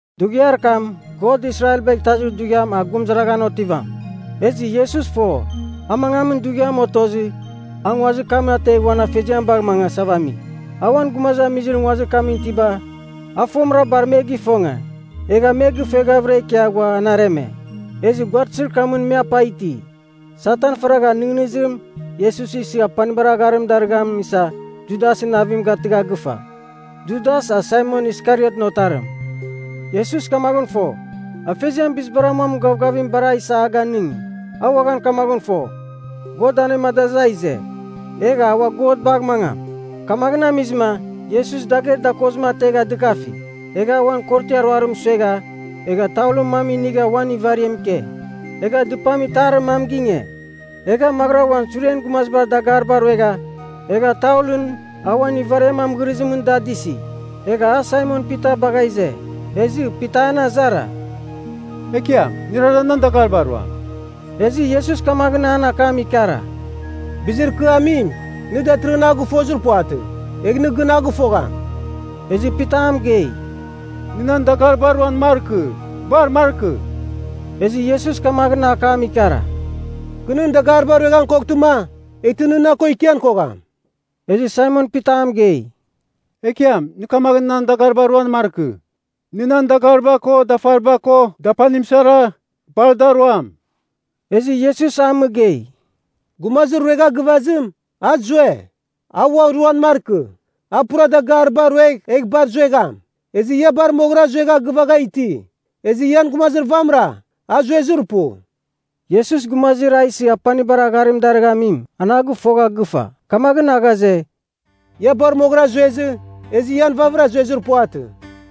Dughiar kam, God Israelbagh Itazir Dughiam a gurumɨzaraghan otivam. Ezɨ Iesus fo, a mangamin dughiam otozɨ, a nguazir kam ategh uan Afeziam bagh mangasava ami. A uan gumazamizir nguazir kamɨn itiba a fomɨra bar me gifonge, egha me gɨfueghavɨra ikia ghua an areme. Ezɨ guaratɨzir kamɨn me apa iti. Satan faragha nɨghnɨzir Iesus isɨ apanibar agharim darɨghamim isa Judasɨn navim gatɨgha gɨfa. Judas, a Saimon Iskariotɨn otarim. Iesus kamaghɨn fo, Afeziam bizibar amuamin gavgavim bar a isa a ganɨngi. A uaghan kamaghɨn fo, God anemadazɨ a ize, egh a ua God bagh mangam. Kamaghɨn amizɨma Iesus dagher dakozim ategha dɨkafi, egha uan korotiar ruarim suegha, egha taulɨn mam inigha uan ivariam ike. Egha dɨpam itarir mam ginge, egha maghɨra uan suren gumazibar dagariba ruegha, egha taulɨn a uan ivariam amɨghɨrizimɨn da adɨsi. Egha a Saimon Pita bagha ize. Ezɨ Pita an azara, “Ekiam, nɨrara nan dagariba ruam?” Ezɨ Iesus kamaghɨn an akam ikara, “Bizir kɨ amim, nɨ datɨrɨghɨn a gɨfozir puvatɨ. Egh nɨ gɨn a gɨfogham.” Ezɨ Pita a mɨgei, “Nɨ nan dagariba ruan markɨ. Bar markɨ!” Ezɨ Iesus kamaghɨn akam ikara, “Kɨ nɨn dagariba rueghan koghtɨma, eghtɨ nɨ na ko ikian kogham.” Ezɨ Saimon Pita a mɨgei, “Ekiam, nɨ kamaghɨn nan dagaribara ruan markɨ. Nɨ nan dagariba ko dafariba ko dapanim sara, bar da ruam!” Ezɨ Iesus a mɨgei, “Gumazir ruegha gɨvazim, a zue, a ua ruan markɨ. A pura dagaribara ruegh egh bar zuegham. Ezɨ ia bar moghɨra zuegha gɨvagha iti. Ezɨ ian gumazir vamɨra, a zuezir pu.” (Iesus gumazir a isɨ apanibar agharim darɨghamim, an a gɨfogha gɨfa. Kamaghɨn a ghaze, “Ia bar moghɨra zuezɨ, ezɨ ian vavɨra zuezir puvatɨ.”)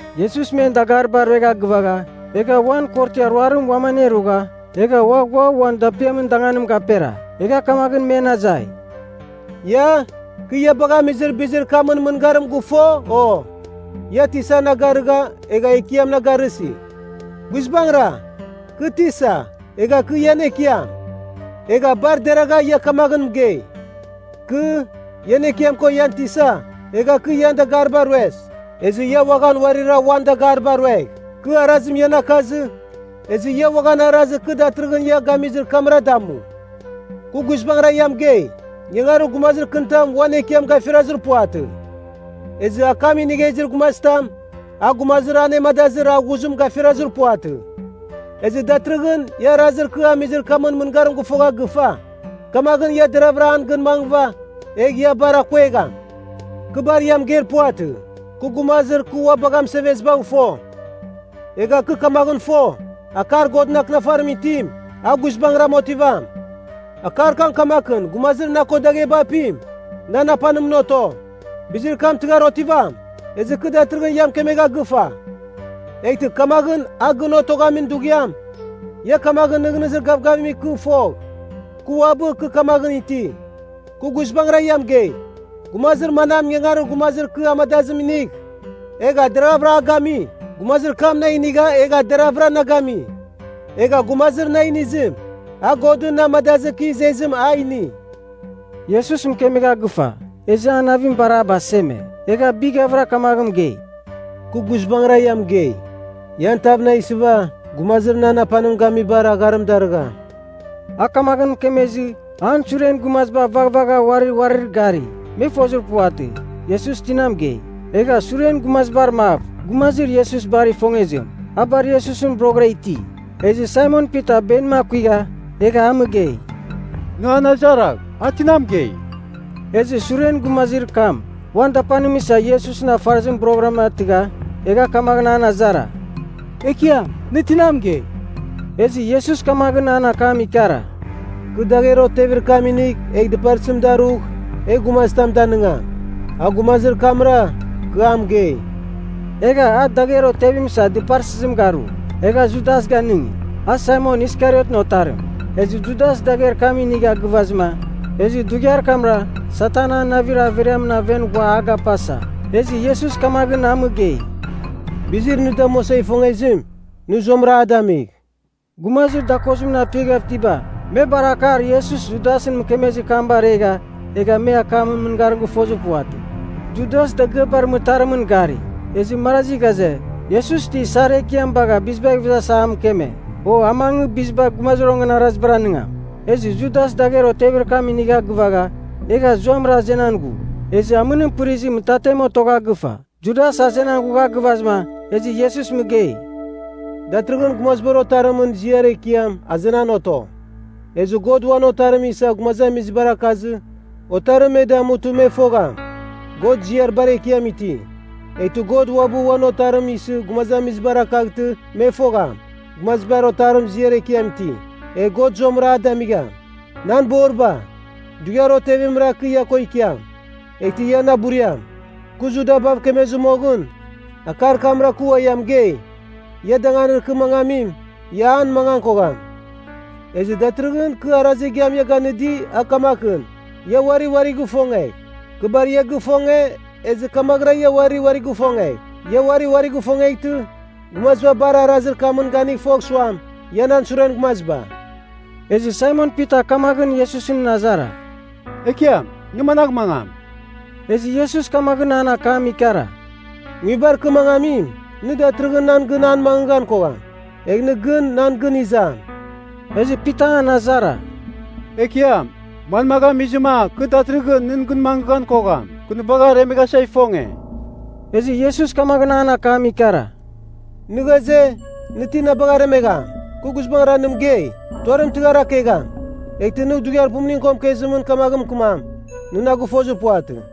Iesus men dagariba ruegha gɨvagha, egha uan korotiar ruarim uam anerugha egha ua ghua uan dapiamin danganim gapera. Egha kamaghɨn men azai, “Ia, kɨ ia bagha amizir bizir kamɨn mɨngarim gɨfo, o? Ia ‘Tisa’ na garɨgha egha ‘Ekiam’ na garɨsi. Guizbangɨra, kɨ Tisa egha kɨ ian Ekiam. Egha bar deragha ia kamaghɨn mɨgei. Kɨ, ian Ekiam ko ian Tisa, egha kɨ ian dagariba rues. Ezɨ ia uaghan uarira uarir dagariba ruegh. Kɨ arazim ian akazɨ, ezɨ ia uaghan arazir kɨ datɨrɨghɨn ia gamizir kamra damu. Kɨ guizbangɨra ia mɨgei, ingangarir gumazir kɨnitam uan Ekiam gafirazir puvatɨ. Ezɨ akam inigha izir gumazitam, a gumazir anemadazir a ghuzim gafirazir puvatɨ. Ezɨ datɨrɨghɨn ia arazir kɨ amizir kamɨn mɨngarim gɨfogha gɨfa, kamaghɨn ia deraghvɨra an gɨn mangɨva, egh ia bar akuegham. “Kɨ bar ia mɨgeir puvatɨ. Kɨ gumazir kɨ ua bagha mɨsevezibagh fo. Egha kɨ kamaghɨn fo, akar Godɨn Akɨnafarimɨn itim, a guizbangɨram otivam. Akar kam kamakɨn ‘Gumazir na ko dagheba apim, nan apanimɨn oto.’ Bizir kam tɨghar otivam, ezɨ kɨ datɨrɨghɨn ia mɨkemegha gɨfa. Eghtɨ kamaghɨn a gɨn otoghamin dughiam, ia kamaghɨn nɨghnɨzir gavgavim ikɨ fogh, Kɨ Uabɨ Kɨ Kamaghɨn Iti. Kɨ guizbangɨra ia mɨgei, gumazir manam ingangarir gumazir kɨ amadazim inigh, egha deravɨra a gami, gumazir kam na inigha egha deravɨra na gami. Egha gumazir na inizim, a Godɨn na amadazɨ kɨ izezim a ini.” Iesus mɨkemegha gɨfa, ezɨ an navim bar a baseme. Egha bighavɨra kamaghɨn mɨgei, “Kɨ guizbangɨra ia mɨgei, ian tav na isɨva gumazir nan apanim gamibar agharim darɨgham.” A kamaghɨn mɨkemezɨ, an suren gumaziba vaghvagha uari uarir gari. Me fozir puvatɨ, Iesus tina mɨgei. Egha suren gumazibar mav, gumazir Iesus bar ifongezim, a bar Iesusɨn boroghɨra iti. Ezɨ Saimon Pita benim akuigha egha a mɨgei, “Nɨ an azaragh, a tina mɨgei?” Ezɨ suren gumazir kam uan dapanim isa Iesusɨn afarɨzim boroghɨram atɨgha, egha kamaghɨn an azara, “Ekiam, nɨ tina mɨgei?” Ezɨ Iesus kamaghɨn an akam ikara, “Kɨ dagher otevir kam inigh egh dɨparsɨzim darugh, egh gumazitam danɨngam. A gumazir kamra, kɨ a mɨgei.” Egha a dagher otevim isa dɨparsɨzim garu, egha Judas ganɨngi, a Saimon Iskariotɨn otarim. Ezɨ Judas dagher kam inigha gɨvazɨma, ezɨ dughiar kamra Satan an navir averiamɨn aven ghua a gapasa. Ezɨ Iesus kamaghɨn a mɨgei, “Bizir nɨ damuasa ifongezim, nɨ zuamɨra a damigh!” Gumazir dakozimɨn apiaghav itiba, me bar akar Iesus Judasɨn mɨkemezir kam baregha, egha me akamɨn mɨngarim gɨfozir puvatɨ. Judas dagɨabar mɨtarimɨn gari. Ezɨ marazi ghaze, Iesus ti isar ekiam bagha bizibagh ivezasa a mɨkeme, o a mangɨ biziba gumazir onganarazibar anɨngam. Ezɨ Judas dagher otevir kam inigha gɨvagha, egha zuamɨra azenan ghu. Ezɨ amɨnim pɨrizɨ mɨtatem otogha gɨfa. Judas azenan ghugha gɨvazɨma, ezɨ Iesus mɨgei, “Datɨrɨghɨn Gumazibar Otarimɨn ziar ekiam azenan oto. Ezɨ God uan Otarim isa gumazamizibar akazɨ Otarim me damutɨ me fogham, God ziar bar ekiam iti. Eghtɨ God uabɨ uan Otarim isɨ gumazamizibar akaghtɨ me fogham, Gumazibar Otarim ziar ekiam iti. Egh God zuamɨra a damigham. Nan boriba, dughiar otevimra kɨ ia ko ikiam. Eghtɨ ia na buriam. Kɨ Judabav mɨkemezɨ moghɨn, akar kamra kɨ ua ia mɨgei, ia danganir kɨ mangamim, ia an mangan kogham. Ezɨ datɨrɨghɨn kɨ arazir igiam ia ganɨdi, a kamakɨn, ia uari uarigh ifongegh. Kɨ bar ia gifonge, ezɨ kamaghɨra ia uari uarigh ifongegh. Ia uari uarigh ifongeghtɨ, gumaziba bar arazir kamɨn ganigh fogh suam, ia nan suren gumaziba.” Ezɨ Saimon Pita kamaghɨn Iesusɨn azara, “Ekiam, nɨ managh mangam?” Ezɨ Iesus kamaghɨn an akam ikara, “Nguibar kɨ mangamim, nɨ datɨrɨghɨn nan gɨn an mangɨghan kogham. Egh nɨ gɨn nan gɨn izam.” Ezɨ Pita an azara, “Ekiam, manmagh amizɨma kɨ datɨrɨghɨn nɨn gɨn mangɨghan kogham? Kɨ nɨ bagh aremeghasa ifonge.” Ezɨ Iesus kamaghɨn an akam ikara, “Nɨ ghaze, nɨ ti na bagh aremegham? Kɨ guizbangɨra nɨ mɨgei, tuarim tɨghar akegham, eghtɨ nɨ dughiar pumuningɨn ko mɨkezimɨn kamaghɨn mɨkɨmam, nɨ na gɨfozir puvatɨ.”